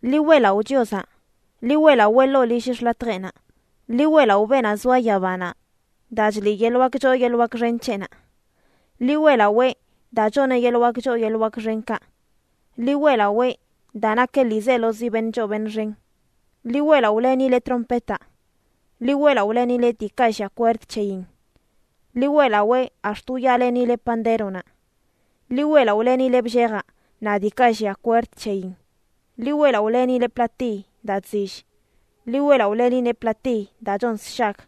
¡Ḻi weꞌlaꞌo Chiozaꞌ! Ḻi weꞌlawee ḻoo lill xḻatjeꞌnaꞌ. Ḻi weꞌlaꞌo beenaꞌ zoa yabanaꞌ daa chliꞌ yeḻꞌ wak choo yeḻꞌ wak xen c̱heꞌnaꞌ. Ḻi weꞌlawee, daa choneꞌ yeḻꞌ wak choo yeḻꞌ wak xenkaꞌ. Ḻi weꞌlawee, daa nakeꞌ ḻiizelozi beṉꞌ choo beṉꞌ xen. Ḻi weꞌlaꞌolenileꞌ trompetaꞌ. Ḻi weꞌlaꞌolenileꞌ diikaꞌ llia kwerd c̱heyin. Ḻi weꞌlawee ax̱t wyaalenileꞌ pandéronaꞌ. Ḻi weꞌlaꞌolenileꞌ bllejaꞌ naꞌ diikaꞌ llia kwerd c̱heyin. Ḻi weꞌlaꞌolenileꞌ platiy daa chzill. Ḻi weꞌlaꞌolenileꞌ platiy daa chon sshag.